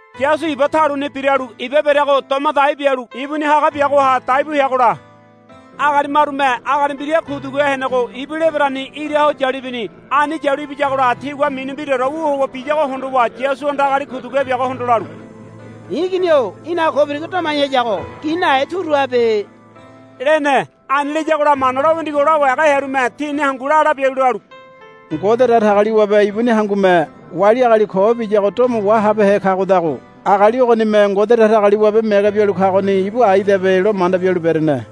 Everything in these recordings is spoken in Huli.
Yasu iba taluni biralu iba bereago doma dai bialu ibuni haga biagoha dai bu heagola agali marume agali mbira kuduguhe henego ibu lebereni ira ho yalu ibini. Ani yalu ibiyagola tigua mini mbiraore wu howa biyago hondowa Yasuhanda agali kuduguhe biagohondo lalu, I̱ igini-o í̠naga ko birigo domai hayago gi nahe turu habe, lene. Ani layagola Mana lo winigo lawai haga hearume tini hangu la la bialu lalu, Ngode Datagaliwabe ibuni hangume wali agali ko biyago domo wahabehe kagodago agali ogonime Ngode Datagaliwabe mege bialu kagoni ibu aidabe, lo manda bialu berene.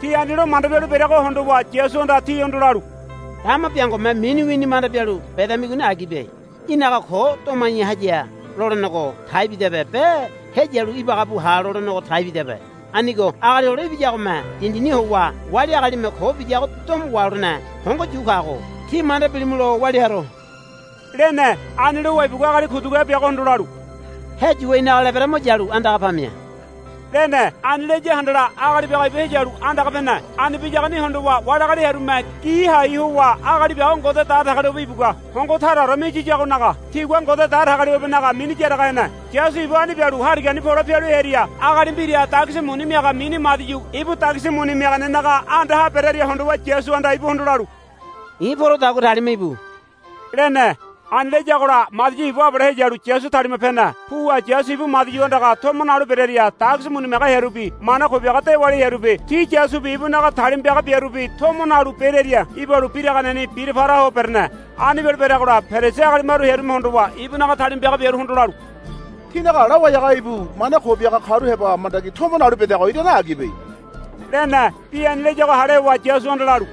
Ti ani lo manda bialu bereago hondowa Yasuhanda tihondo lalu, Dama biangome mini wini manda bialu bedamigoni agibe. Í̠naga ko domai haya lolenego taibidabe be heyalu ibaga bu ha lolenego taibidabe. Anigo Agali Hole Ibiyagome dindini howa wali agalime ko biyago domo waholene hongo yu kago tí manda bilimulo walia haro, lene. Ani lowa ibugua agali kuduguhe biagohondo lalu, Heyuwa í̠naga lebere mo yalu andaga pamia, lene. Ani laya handala agali biago ibu heyalu andaga pene. Ani biyagoni hondowa wali agali hearume gi hai howa agali biago Ngode Datagaliwabe ibugua hongo taraore miyiyagonaga tigua Ngode Datagaliwabenaga mini yaraga hene. Yasu ibu ani bialu harigani pole pialu hearia agali mbira dagisi muni miaga mini Madiu ibu dagisi muni miaganenaga andaha berearia hondowa Yasuhanda ibuhondo lalu, I̱ porodagua talima íbu, lene. Ani layagola Madiu ibu abale heyalu Yasu talima pene. Puwa Yasu ibu Madiu andaga tomo nalu berearia dagisi muni miaga hearubi mana ko biaga dewali hearubi ti Yasubi ibunaga talima piaga biarubi tomo nalu berearia ibalu biraganeni bira para ho berene. Ani bialu bereagola Perisi agali maru hearume hondowa ibunaga talima piaga biaruhondo lalu, Tínaga lawai haga ibu mana ko biaga karu heba mandagi tomo nalu bedago irane agibe, lene. Bi ani layago hale howa Yasuhanda lalu,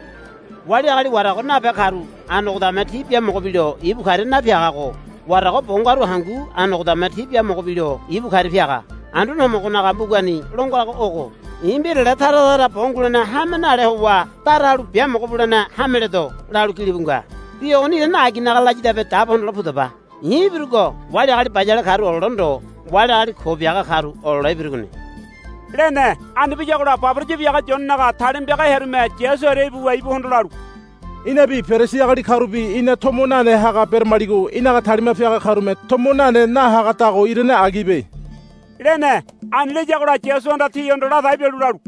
Wali agali warago nabe karu anogodame ti biamogo bilo ibu karia napiagago warago bo ngaru hangu anogodame ti biamogo bilo ibu karia piaga. Anduane Homogonaga mbugani lo ngago ogo, I̱ mbirale tara tara bo ngulene hame nale howa dara halu biamogo bulene hame ledo, lalu gilibu nga. Bi ogoni irane aginaga layadabe dabo hondole pudaba. I̱ ibirugo wali agali bayale karu olole ndo wali agali ko biaga karu olole ibirugoni, lene. Ani biyagola baboraya biaga Yonenaga talima piaga hearume Yasu hearia ibuwa ibuhondo lalu, Inabi Perisi agali karubi ina tomo nane haga beramaligo í̠naga talima piaga karume tomo nane nahagadago irane agibe, lene. Ani layagola Yasuhanda tihondo ladai bialu lalu,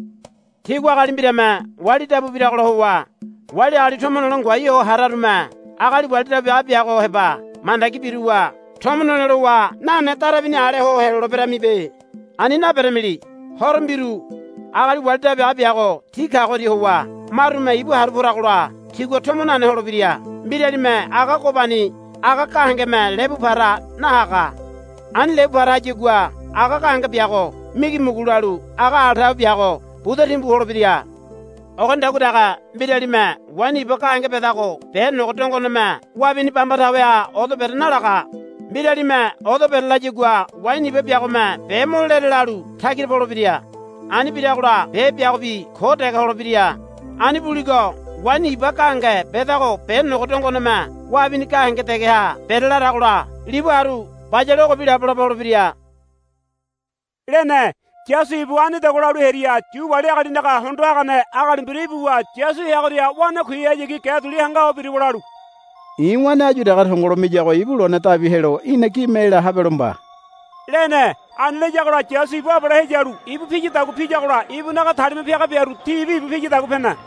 Tígua agali mbirame wali dabu biragola howa wali agali tomo nole ngoai ho hararume agali wali dabu biaga biago heba mandagi biruwa tomo nole lowa nane darabini ale ho heloleberamibe. Ani naberamili. Horo mbiru agali wali dabu biaga biago ti kagoria howa marume ibu haru poragola tigua tomo nane holebira. Mbiralime aga gobani aga gahengeme lebu para nahaga. Ani lebu para hayagua aga gahenge biago migimugu lalu aga ala tawe biago buda timbu holebira. Ogonidagua dege mbiralime waini iba gahenge bedago be nogo dongoneme wabini bamba taweha odo bere nalaga. Mbiralime odo bere layagua waini iba biagome be mo lere lalu tagira polebira. Ani biragola be biagobi ko dege holebira. Ani buligo waini iba gahenge bedago be nogo dongoneme wabini gahenge degeha bere laragola libu haru bayale ogobi labolabo holebira, lene. Yasu ibu anidagua lalu hearia Yu wali agalinaga hondo hagane agali mbira ibuwa Yasu heagoria wanakuihayagi ge duli hanga ho biruwa lalu, I̱ wane áyu dege tongolo miyago ibu lone dabi helo í̠na gime ela habelo mba, lene. Ani layagola Yasu ibu abale heyuwa ibu piyadagua piyagola ibunaga talima piaga biaru tibi ibu piyadagua pene.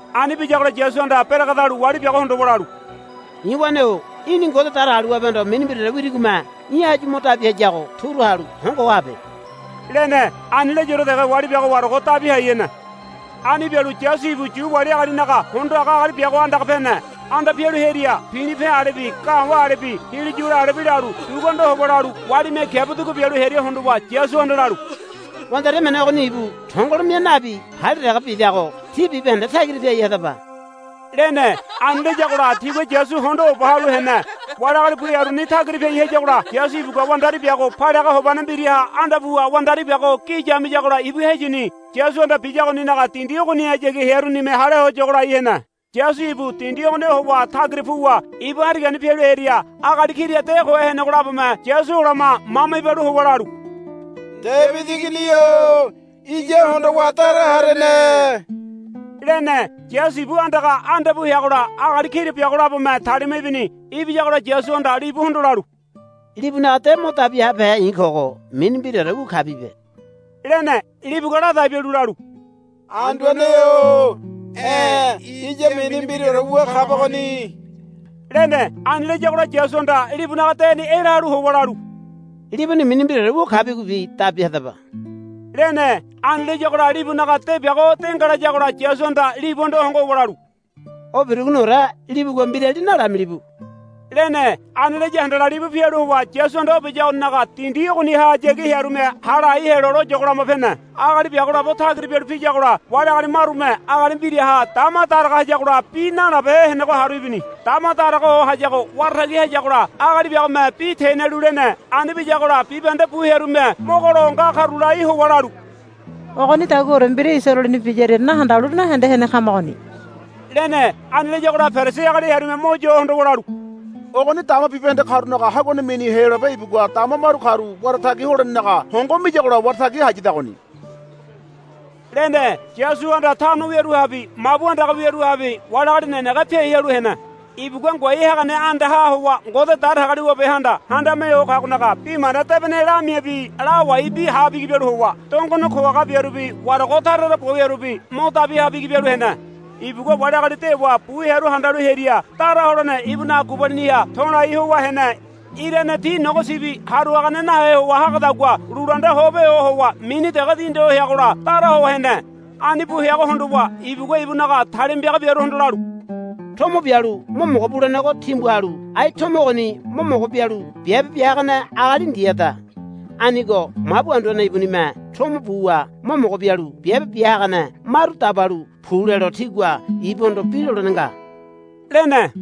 Ani biyagola Yasuhanda beregedalu wali biago hondowa lalu, I̱ wane-o í̠ni Ngode Datagaliwabehondo mini mbiraore wirigome í̠ áyu mo dabi hayago turu halu hongoho habe, lene. Ani layaore dege wali biago warago dabi hai hene. Ani bialu Yasu ibu Yu wali agalinaga hondo haga agali biago andaga anda pene. Anda pialu hearia pilipe alebi ga̱wa̱ alebi hiliyula alebi lalu dugu anda howa lalu walime kiabu dugu bialu hearia hondowa Yasuhanda lalu, Wandari emene ogoni ibu tongolo mia nabi palia dege bidago tí bibahende tagira piai hadaba, lene. Ani layagola tigua Yasu hondo oba halu hene. Wali agali bu hearuni tagira piai hayagola Yasu ibugua wandari biago paliaga hobane mbiraha anda puwa wandari biago gi yamiyagola ibu heyini. Yasuhanda biyagoninaga dindi ogonihayagi hearunime hale ho yogo lai hene. Yasu ibu dindi ogoniha howa tagira puwa ibu harigani pialu hearia agali kira de kohe henego labome Yasu olama mama ibalu howa lalu, Debidi Igini-o iya hondowa dara harene, lene. Yasu ibu andaga anda pu heagola agali kira biago labome talima ibini. Ibiyagola Yasuhanda libuhondo lalu, Libunaga de o dabi habehe i̱ kogo mini mbiraore wu kabibe, lene. Libugua ladai bialu lalu, Anduane-o e̱ iya mini mbiraore wu kabagoni, lene. Ani layagola Yasuhanda libunaga deni ela halu howa lalu, Líbuni mini mbiraore wu kabigobi dabi hadaba, lene. Ani layagola libunaga de biago de ngalayagola Yasuhanda libuhondo hongo howa lalu, O birugoniore libugua mbirali nalamilibu, lene. Ani laya handala libu pialu howa Yasuhanda o biyagoninaga dindi ogonihayagi hearunime hale hai helo lo yogo lama pene. Agali biago labo tagira pialu piyagola wali agali marume agali mbiraha dama daraga hayagola bi nalabehe henego haru ibini. Dama daraga ho hayago wara tagi hayagola agali biagome bi tenialu lene. Ani biyagola bibahende bu hearume mogo lo nga karu lai howa lalu, Ogonidaguaore mbira Isaraeleni biyaria nahandalu nahende hene kamagoni, lene. Ani layagola Perisi agali hearume mo yo hondowa lalu, Ogoni dama bibahende karunaga haguane mini Heyolabe ibugua dama maru karu wara tagi holenenaga hongo miyagola wara tagi hayadagoni, lene. Yasuhanda tano wiaruhabi mabu andaga wiaruhabi wali agali nenege piai halu hene. Ibugua ngoai hagane andaha howa Ngode Datagaliwabehanda Handame Ho Kagonaga Bi Mana Debene lamiabi lawaibi ha bigi bialu howa dongone ko haga biarubi warago tara tara bo wiarubi mo dabi ha bigi bialu hene. Ibugua wali agali dewa bu hearu handalu hearia dara holene ibunaga gubaliniha to̱lai howa hene. Irane ti nogo sibi haru hagane nahe howa hagadagua lulu anda ho pe ho howa mini dege dindi ho heagola dara ho hene. Ani bu heago hondowa ibugua ibunaga talima piaga biaruhondo lalu, Tomo bialu mo mogo bulenego timbu halu ai tomo ogoni mo mogo bialu biabe bia hagane agali ndiada. Anigo mabu anduane ibunime tomo buwa mo mogo bialu biabe bia hagane maru dabalu pu lelo tígua ibuhondo bi lolene nga, lene.